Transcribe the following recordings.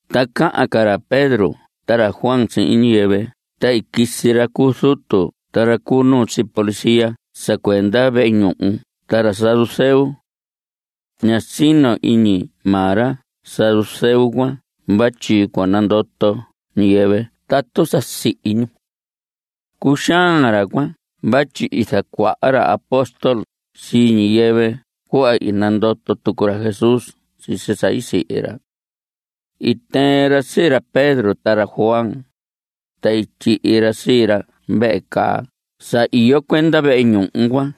Ta cahan ca ra Pedro ta ra Juan sihin ñiyɨvɨ ta i quisi ra cu zutu ta ra cu nuu sii policía sa cuenda vehe ñuhu ta ra saduceo. (Ña sino iñi maa ra saduceo cuan vatyi cua nandoto ñiyɨvɨ tatu sa sihi ñu.) Cuxaan ra cuan vatyi zacuaha ra apóstol sii ñiyɨvɨ cuhva i nandoto tucu ra Jesús sisi sa i sihi ra. I tɨɨn ra sii ra Pedro ta ra Juan, ta i tyihi ra sii ra vehe caa sa iyo cuenda vehe ñuhu cuan.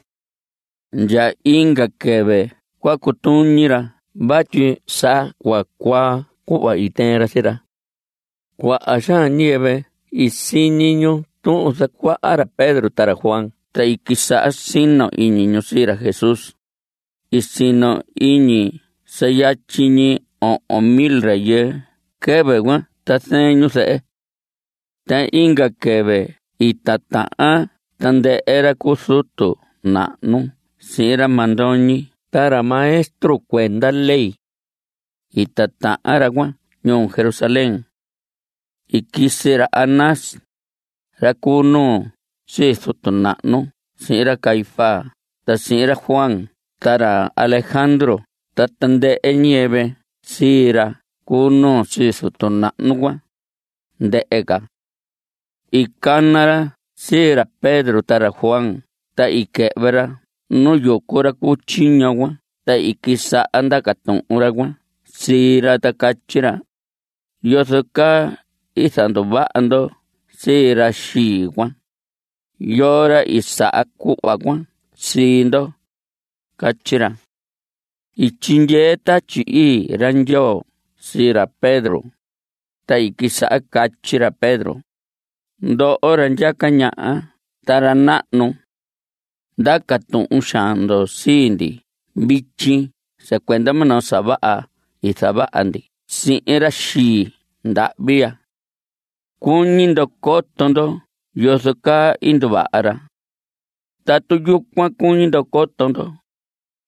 Ndya inga quɨvɨ cua cutuñi ra vatyi sa cua cuaa cuhva i tɨɨn ra sii ra. Cuaha xaan ñiyɨvɨ i siñi ñu tuhun zacuaha ra Pedro ta ra Juan ta i quisaha sino iñi ñu sii ra Jesús. I sino iñi sa yatyi ñi ohon mil rayɨɨ quɨvɨ cuan ta zɨɨn ñu zɨhɨ. Ta inga quɨvɨ i titahan tandɨhɨ ra cu zutu nahnu sihin ra mandoñi ta ra maestro cuenda ley. I titahan ra cuan ñuu Jerusalén. I quisi ra Anás, ra cu nuu sii zutu nahnu sihin ra Caifás ta sihin ra Juan ta ra Alejandro ta tandɨhɨ ñiyɨvɨ sii ra cu nuu sii zutu nahnu cuan, ndɨhɨ ca. I cana ra sii ra Pedro ta ra Juan ta i quɨhvɨ ra nu yucu ra cu tyiño cuan ta i quisaha ndaca tuhun ra cuan sii ra ta catyi ra: ¿Yozo caa i zanduvaha ndo sii ra xii cuan? ¿Yoo ra i saha cuhva cuan sii ndo? Catyi ra. I tyindyee Tatyi Ii ra Ndyoo sii ra Pedro, ta i quisaha catyi ra Pedro: Ndoho ra ndyaca ñaha ta ra nahnu, ndaca tuhun xaan ndo sii ndi vityi sa cuenda minoo sa vaha i zavaha ndi sihin ra xii ndahvi ya. Cuñi ndo coto ndo yozo caa i nduvaha ra. Tatu yucuan cuñi ndo coto ndo,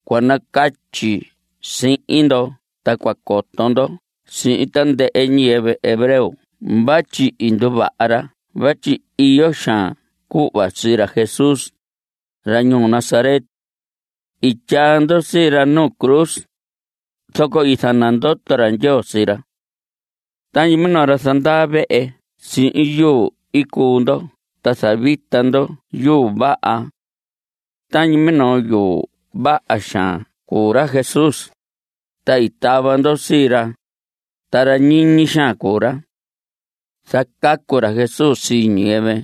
cua nacatyi sihin ndo ta cua coto ndo sihin tandɨhɨ ñiyɨvɨ hebreo vatyi i nduvaha ra vatyi iyo xaan cuhva sii ra Jesús, ra ñuu Nazaret. I tyaa ndo sii ra nu cruz, zoco i zanandoto ra Ndyoo sii ra. Tañi minoo ra zandaa vehe sihin yuu cuu ndo ta zavita ndo yuu vaha. Tañi minoo yuu vaha xaan cuu ra Jesús, ta i tava ndo sii ra, ta ra ñiñi xaan cuu ra. Zacacu ra Jesús sii ñiyɨvɨ,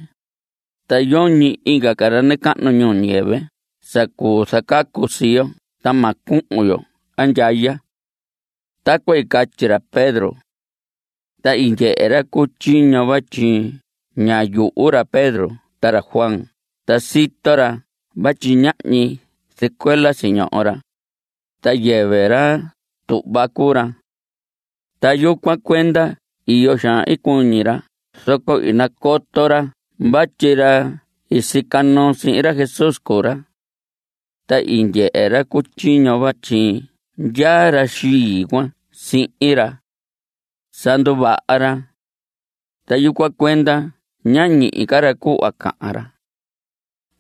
ta yoñi inga ca ra nacahnu ñuu ñiyɨvɨ sa cuu zacacu sii yo ta ma cuhun yo andyaya. Tacuan i catyi ra Pedro. Ta i ndyehe ra cu tyiño vatyi ña yuhu ra Pedro ta ra Juan ta sito ra vatyi ñahñi zɨcuela siñoho ra (ta yɨvɨ ra tuhva cuu ra). Ta yucuan cuenda iyo xaan i cuñi ra zoco i nacoto ra vatyi ra i sica noo sihin ra Jesús cuu ra. Ta i ndyehe ra cu tyiño vatyi ndyaa ra xii cuan sihin ra. Sa nduvaha ra. Ta yucuan cuenda ñá ñihi ca ra cuhva cahan ra.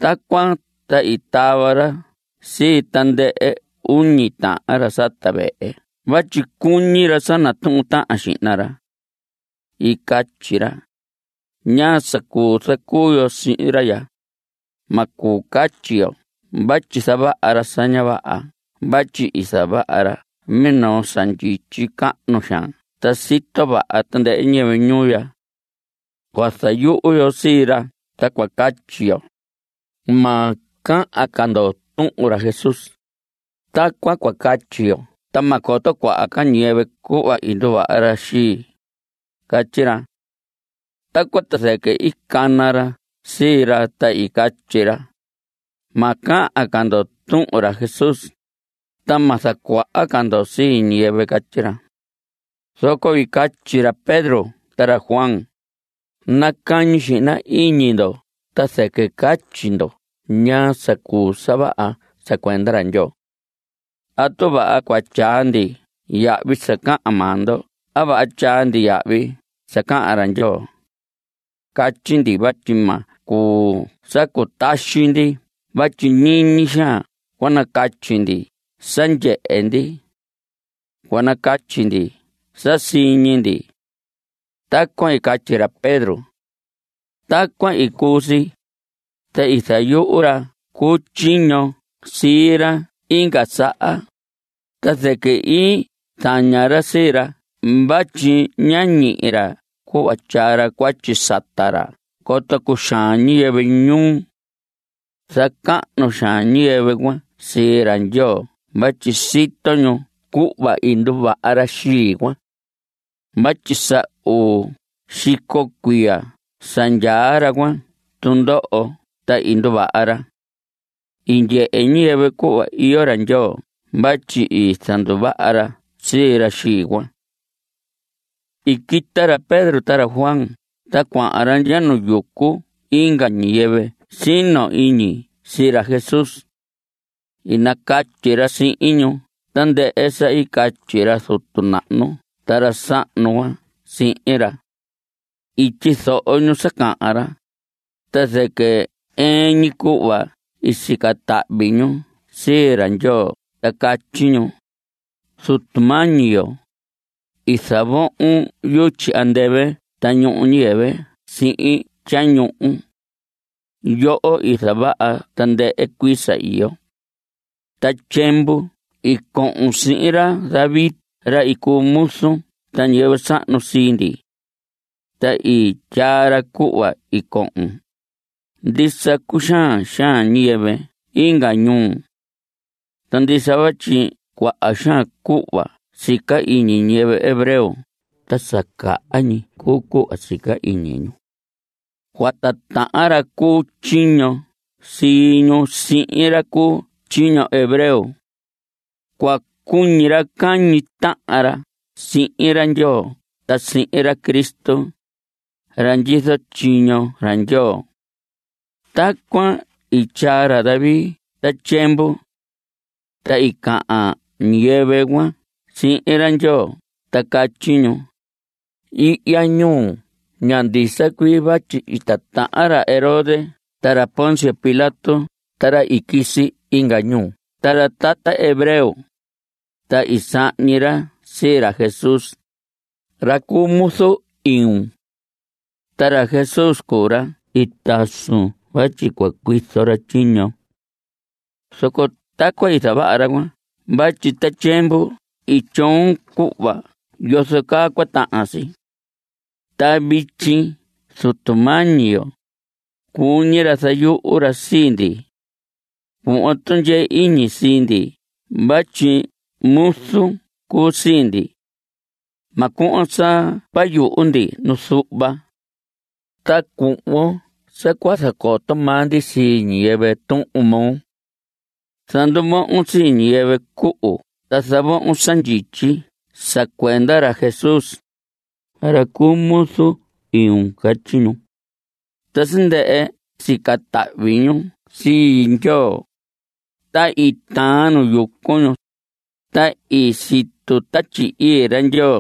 Tacuan ta i tava ra sii tandɨhɨ uñi tahan ra sata vehe vatyi cuñi ra sa natuhun tahan xihna ra. I catyi ra: ¿Ñaa sa cuu zacuu yo sihin ra ya? Ma cuu catyi yo vatyi zavaha ra sa ña vaha vatyi i zavaha ra minoo sa ndyityi cahnu xaan ta sito vaha tandɨhɨ ñiyɨvɨ ñuu ya. Cua zayuhu yo sii ra ta cua catyi yo: “Ma cahan ca ndo tuhun ra Jesús.” Tacuan cua catyi yo ta ma coto cuaha ca ñiyɨvɨ cuhva i nduvaha ra xii. Catyi ra. Tacuan ta zɨquɨ i cana ra sii ra ta i catyi ra: Ma cahan ca ndo tuhun ra Jesús, ta ma zacuaha ca ndo sii ñiyɨvɨ. Catyi ra. Zoco i catyi ra Pedro ta ra Juan: Nacañi xihna iñi ndo ta zɨquɨ catyi ndo ñaa sa cuu sa vaha sa cuenda ra Ndyoo. ¿Atu vaha cua tyaa ndi yahvi sa cahan maa ndo a vaha tyaa ndi yahvi sa cahan ra Ndyoo? Catyi ndi vatyi ma cuu sa cutaxi ndi vatyi ñiñi xaan cua nacatyi ndi sa ndyehe ndi. Cua nacatyi ndi sa siñi ndi. Tacuan i catyi ra Pedro. Tacuan i cuu si, ta i zayuhu ra cu tyiño sii ra inga saha, ta zɨquɨ i zaña ra sii ra vatyi ñá ñihi ra cuhva tyaa ra cuatyi sata ra coto cuxaan ñiyɨvɨ ñuu. Zacahnu xaan ñiyɨvɨ cuan sii ra Ndyoo vatyi sito ñu cuhva i nduvaha ra xii cuan. Vatyi sa uu xico cuiya sa ndyaa ra cuan tundoho ta i nduvaha ra. I ndyehe ñiyɨvɨ cuhva iyo ra Ndyoo vatyi i zanduvaha ra sii ra xii cuan. I quita ra Pedro ta ra Juan ta cuahan ra ndya nu yucu inga ñiyɨvɨ sino iñi sii ra Jesús. I nacatyi ra sihin ñu tandɨhɨ sa i catyi ra zutu nahnu ta ra sahnu cuan sihin ra. I tyizoho ñu sa cahan ra, ta zɨquɨ ɨɨn ñi cuhva i sica tahvi ñu sii ra Ndyoo ta catyi ñu: Zutu mañi yo, i zavohon yutyi andɨvɨ ta ñuhu ñuu ñiyɨvɨ sihin tyañuhu. Yoho i zavaha tandɨhɨ cuii sa iyo. Ta tyiemvu i cohon sihin ra David ra i cuu muzun ta ñiyɨvɨ sahnu sii ndi. Ta i tyaa ra cuhva i cohon: Ndisa cuxaan xaan ñiyɨvɨ inga ñuu. Ta ndisa vatyi cuaha xaan cuhva sica iñi ñiyɨvɨ hebreo ta sa caha ñi cuu cuhva sica iñi ñu. Cua titahan ra cu tyiño sii ñu sihin ra cu tyiño hebreo. Cua cuñi ra cahñi tahan ra sihin ra Ndyoo ta sihin ra Cristo, ra ndyizo tyiño ra Ndyoo. Tacuan i tyaa ra David ta tyiemvu. Ta i cahan ca ñiyɨvɨ cuan sihin ra Ndyoo ta catyi ñu: Ihya ñuu ya ndisa cuii vatyi i titahan ra Herodes ta ra Poncio Pilato ta ra i quisi inga ñuu ta ra tata hebreo, ta i sahñi ra sii ra Jesús, ra cuu muzu iun. Ta ra Jesús cuu ra i tasun vatyi cua cuizo ra tyiñon. Zoco tacuan i zavaha ra cuan vatyi ta tyiemvu i tyoon cuhva yozo caa cua tahan si. Ta vityi Zutu mañi yo, cuñi ra zayuhu ra sii ndi. Cuhvon tundyee iñi sii ndi vatyi muzun cuu sii ndi. Ma cuhvon sa cua yuhu ndi nu zuhva. Ta cuhvon sa cua zacoto maa ndi sii ñiyɨvɨ Tuhun moo. Zanduvohon sii ñiyɨvɨ cuhu ta zavohon sa ndyityi sa cuenda ra Jesús, ra cuu muzu iun. Catyi ñu. Ta sa ndɨhɨ sica tahvi ñu sii Ndyoo, ta i taan nu yucu ñu, ta i situ Tatyi Ii ra Ndyoo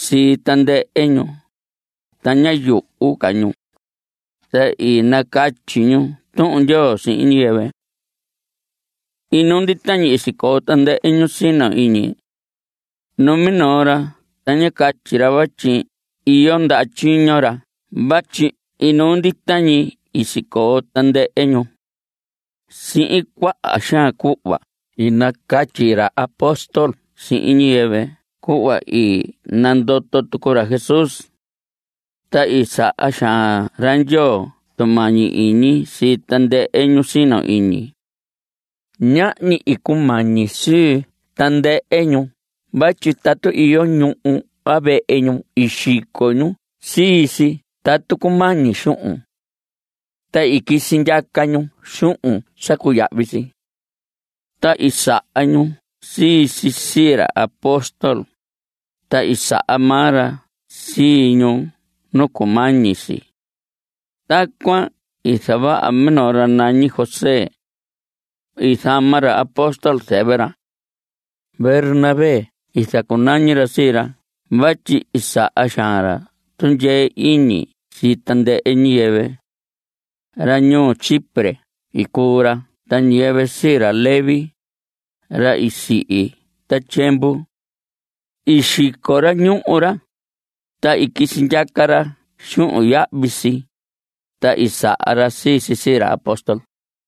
sii tandɨhɨ ñu, ta ñá yuhu ca ñu, ta i nacatyi ñu Tuhun Ndyoo sihin ñiyɨvɨ. Inuu ndita ñi i sicoo tandɨhɨ ñu sino iñi. Numinoo ra ta ñá catyi ra vatyi iyo ndaha tyiño ra vatyi inuu ndita ñi i sicoo tandɨhɨ ñu. Sihin cuaha xaan cuhva i nacatyi ra apóstol sihin ñiyɨvɨ cuhva i nandoto tucu ra Jesús. Ta i saha xaan ra Ndyoo tumañi iñi sii tandɨhɨ ñu sino iñi. Ñahñi i cumañi sii tandɨhɨ ñu vatyi tatu iyo ñuhu a vehe ñu i xico ñu sii si tatu cumañi xuhun. Ta i quisi ndyaca ñu xuhun sa cuyahvi si. Ta i saha ñu sii si sii ra apóstol, ta i saha maa ra sii ñu nu cumañi si. Tacuan i zavaha minoo ra nañi José. I zama ra apóstol zɨvɨ ra. Bernabé i zacunañi ra sii ra vatyi i saha xaan ra tundyee iñi sii tandɨhɨ ñiyɨvɨ. Ra ñuu Chipre i cuu ra ta ñiyɨvɨ sii ra Leví, ra i sihi ta tyiemvu. I xico ra ñuhu ra, ta i quisi ndyaca ra xuhun yahvi si, ta i saha ra sii si sii ra apóstol.